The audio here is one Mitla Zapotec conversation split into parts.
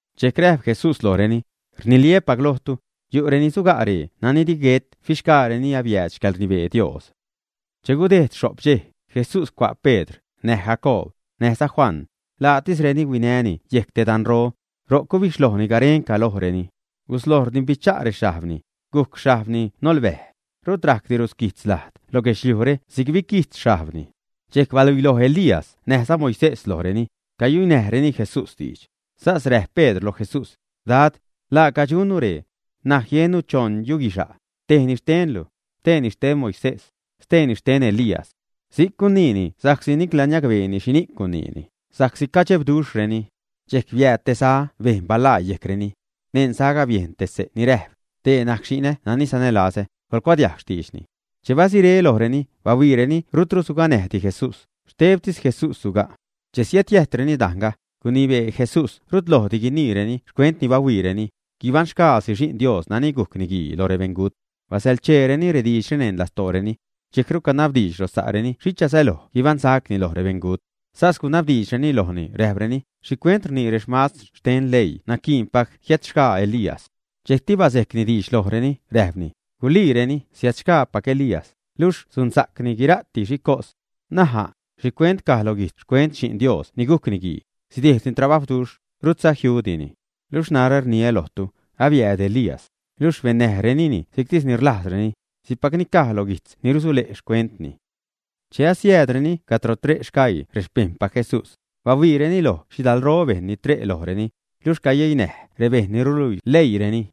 Dxejc räjp Jesús lojreni: ―Rniliä́pac lojtu, yu'reni suga' ree nani di guet fixgaareni abiääd xcäḻrnibee Dios. Che gudejd xho'p dxej, Jesús cua' Pedr, näj Jacoob, näjza Juan, laatisreni huinäni yejc te danro. Ro'c gubixhlojni garenca lojreni. Gusloj rdimbicha' rexhajbni, gujc xhajbni nolbäj. Rut rajcti rusquijtz lajd lo guedxliujre si'c biquijtz xhajbni. Dxejc baluiiloj Elías näjza Moisés lojreni, cayuinäjreni Jesús diidx. Sas räjp Pedr loj Jesús: ―Dad, laaca dxunnu ree. N̲aj jiennu choṉ yuguixa', tejni xtenlu, steeni xten Moisés, steeni xten Elías. Si'c guniini sa'csi nicla niacbeeni xhini'c guiniini, sa'csi cadxebduxhreni. Dxejc biääd te za bejn balaa yejcreni. Neṉ zaga biejn xse' te ni räjp: ―Dee najc xi'nä nani sanälazä, coḻcuadiajg xtiidxni. Che batzuré lojreni, bahuiireni rutru suganäjti Jesús, xtebtis Jesús suga'. Che siädjiäjtreni dajnga, gunibee Jesús rut lojdi guiniireni xcuent ni bahuiireni, guibaṉxgaasi Xi'n Dios nani gujc Niguii lo rebeṉgut. Basäḻcheereni rediidxre neṉ lastooreni. Dxejcru canabdiidx lo sa'reni xhicha säloj guibaṉsacni lo rebeṉgut. Sas gunabdiidxreni lojni, räjpreni: ―¿Xhicuent rnii remastr xten leii naquiinpac jiädxgaa Elías? Dxejcti bazejcni diidx lojreni, räjpni: ―Guliireni siädxgaapac Elías, luxh sunsa'cni guira'ti xhi cos. N̲aj a', ¿xhicuent caj lo guijtz xcuent Xi'n Dios ni gujc Niguii, sidejdni trabajwduxh, rutza jiudini? Luxh narä rniä lojtu, abiääd Elías, luxh bennäjrenini si'ctis ni rlajzreni, si'cpac ni caj loj guijtz ni rusule' xcuentni. Che asiäädreni cadro tre' sgaii rexpejṉpac Jesús, bahuiireni loj xhidalro bejṉ ni tre' lojreni, luxh cayeinäj rebejṉ ni ruluii leiireni.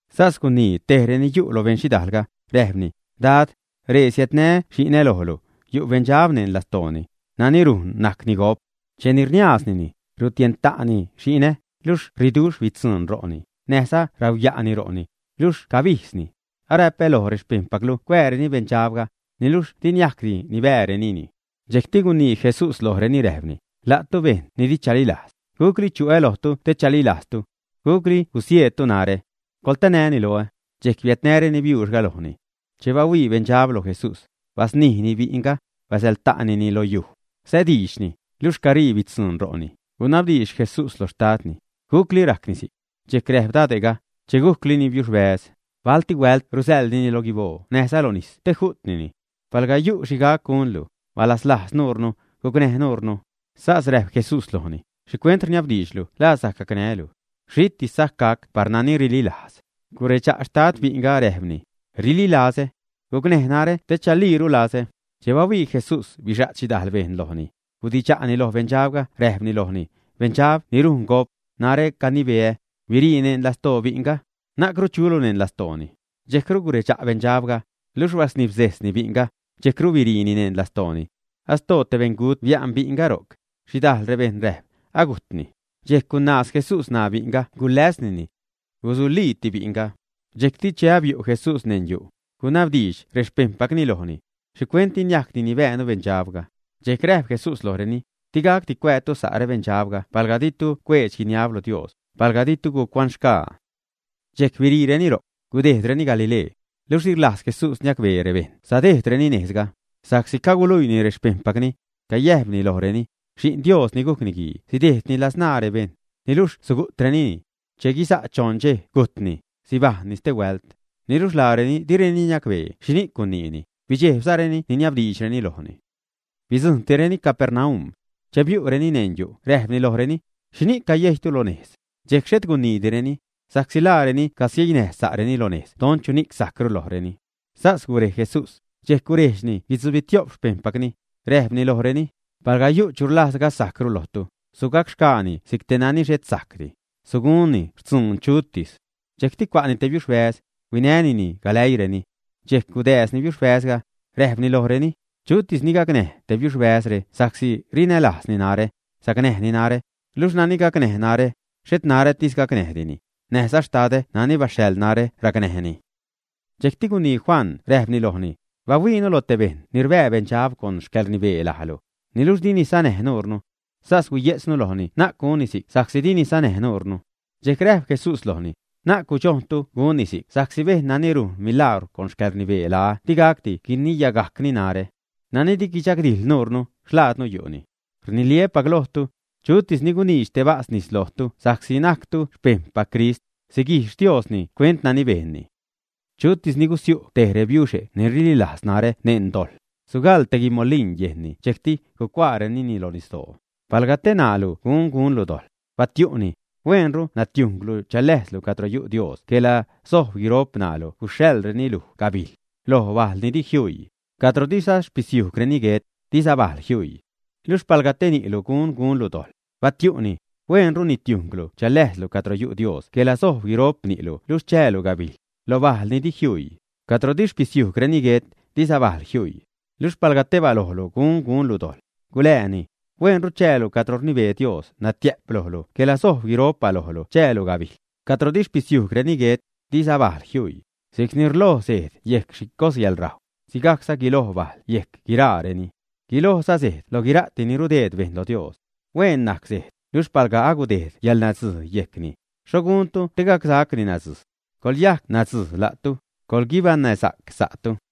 Sas gunii tej reni yu' lo beṉxhidaalga, räjpni: ―Dad, ree siädnää́ xi'nä lojlu, yu' beṉdxab neṉ lastooni, nani rujn najcni gop. Cheni rniaaznini, rutienta'ni xi'nä, luxh ṟiduxh bitzuṉ ro'ni, näjza rauya'ni ro'ni, luxh cabijdzni. Aräpä loj rexpejṉpaclu cuääreni beṉdxabga, niluxh di niajcdi nibäärenini. Dxejcti gunii Jesús lojreni, räjpni: ―La'tu, bejṉ ni di chalilajz, ¿gucli chu'ä lojtu te chalilajztu? ¿Gucli gusieedtu narä? ¡Coḻtanäni loä! Dxejc biädnäreni biuuxga lojni. Che bahuii beṉdxab lo Jesús, basnijni bi'nga, basäḻta'tinini lo yuj. Sädiidxni, luxh caṟii bitzuṉ ro'ni. Gunabdiidx Jesús loj xtadni: ―¿Gucli rajcni si'c? Dxejc räjp dade'ga: ―Che gujclini biuxbäz. Balti huält rusäḻnini lo guiboo näjza lo nis te ju'tnini. Palga yu' xhi gac gunlu, balazlajz nuunu, gucnäj nuunu. Sas räjp Jesús lojni: ―¿Xhicuent rniabdiidxlu la sajc gacnää́lu? Xhitis sajc gac par nani rililajz. Guredxa' xtad bi'nga, räjpni: ―¡Rililazä! Gucnäj narä te chaliiru lazä. Che bahuii Jesús bixa't xhidajl bejṉ lojni, gudidxa'ni lo beṉdxabga räjpni lojni: ―Beṉdxab ni rujn gop, narä canibeä, birii neṉ lastoo bi'nga. Na'cru chulu neṉ lastooni. Dxejcru guredxa' beṉdxabga, luxh basnibzejsni bi'nga, dxejcru biriini neṉ lastooni. Astoo te beṉgut bia'n bi'nga ro'c. Xhidajl rebejṉ räjp: ―Agujtni. Dxejc gunaaz Jesús ṉaa bi'nga guläsnini. Guzuliiti bi'nga. Dxejcti che abiu' Jesús neṉ yu', gunabdiidx rexpejṉpacni lojni: ―¿Xhicuent di niajcdi nibäänu beṉdxabga? Dxejc räjp Jesús lojreni: ―Di gacdi cuäätu sa' beṉdxabre palga ditu cuedx-guinab lo Dios, palga ditu gucuaṉxgaa. Dxejc biriireni ro'c, gudejdreni Galilee. Luxh di rlajz Jesús niacbee rebejṉ sadejdreni nejzga, sa'csi caguluiini rexpejṉpacni. Cayäjpni lojreni: “Xi'n Dios ni gujc Niguii sidejdni ladzṉaa rebejṉ, niluxh sugu'trenini. Che guiza' choṉ dxej gujtni, sibajṉni stehuält.” Niluxh laareni direni niacbee xhini'c guniini, bidxejbzareni niniabdiidxreni lojni. Bidzujṉtireni Capernaum. Che biu'ni neṉ yu' räjpni lojreni: ―¿Xhini'c cagusiejytu lo nejz? Dxejc xhet guniitireni, sa'csi laareni cagusieinäj sa'reni lo nejz don chuni'c sajcru lojreni. Sas gurej Jesús, dxejc gurejdxni guitzubitio'p xpejṉpacni, räjpni lojreni: ―Palga yu' chu rlajz gasajcru lojtu, sugacxgaani si'c te nani xhet sajcti, sugunzani xtzuun chutis. Dxejcti cua'ni tej biuxbäz, huinänini galäiireni. Dxejc gudääzni biuxbäzga, räjpni lojreni: ―Chutis ni gacnäj te rebiuxe're sa'csi rinälajzni narä, sacnäjni narä, luxh nani gacnäj narä, xhet narätis gacnäjtini, näjza xtadä nani baxhaḻ narä racnäjni. Dxejcti gunii Juan räjpni lojni: ―Bahuiinu lo te bejṉ ni rbää beṉdxab con xcäḻrnibee lajlu, niluxh dini sanäj nuunu. Sas huiye'tznu lojni na'c gunni si'c sa'csi dini sanäj nuunu. Dxejc räjp Jesús lojni: ―Na'c gudxojntu gunni si'c sa'csi bejṉ nani rujn milagwr con xcäḻrnibee laä digacdi guiniyagajcni narä. Nani di guidxagdijḻ nuunu, xlaadnu yu'ni. Rniliä́pac lojtu, chutis ni guniidx te bas nis lojtu sa'csi najctu xpejṉpac Crist, siguijx Diosni xcuent nani bejnni. ’Chutis ni gusiu' tej rebiuxe' ni rililajz narä neṉ dojḻ, sugaḻ te guimolin yejnni dxejcti gucuaarenini lo nisdoo. Palga tej ṉaalu gun gunlu dojḻ, batiu'ni: hueenru natiujnglu chaläjzlu cadro yu' Dios quela sojb guiro'p ṉaalu gusäḻreni luj gabijl, loj bajl ni di jiuii, cadro diza xpisiujgreni guet, diza bajl jiuii. Luxh palga tej ni'lu gun gunlu dojḻ, batiu'ni: hueenru nitiujnglu chaläjzlu cadro yu' Dios quela sojb guiro'p ni'lu luxh chäälu gabijl, lo bajl ni di jiuii, cadro di xpisiujgreni guet, diza bajl jiuii. Luxh palga tej balojlu gun gunlu dojḻ, gulääni: hueenru chäälu cadro rnibee Dios natiä'p lojlu quela sojb guiro'p balojlu chäälu gabijl, cadro di xpisiujgreni guet, diza bajl jiuii. ’Si'cni rloj sejd yejc xhi cos yäḻrajw, si'cza guiloj bajl yejc guiraareni. Guilojza sejd lo guira'ti ni rdeed bejṉ lo Dios. Hueen najc sejd, luxh palga agudejd yäḻnadzij yejcni, ¿xho guntu te gacsacni nadzij? Coḻyajc nadzij la'tu, coḻguibaṉnäsa'c sa'tu.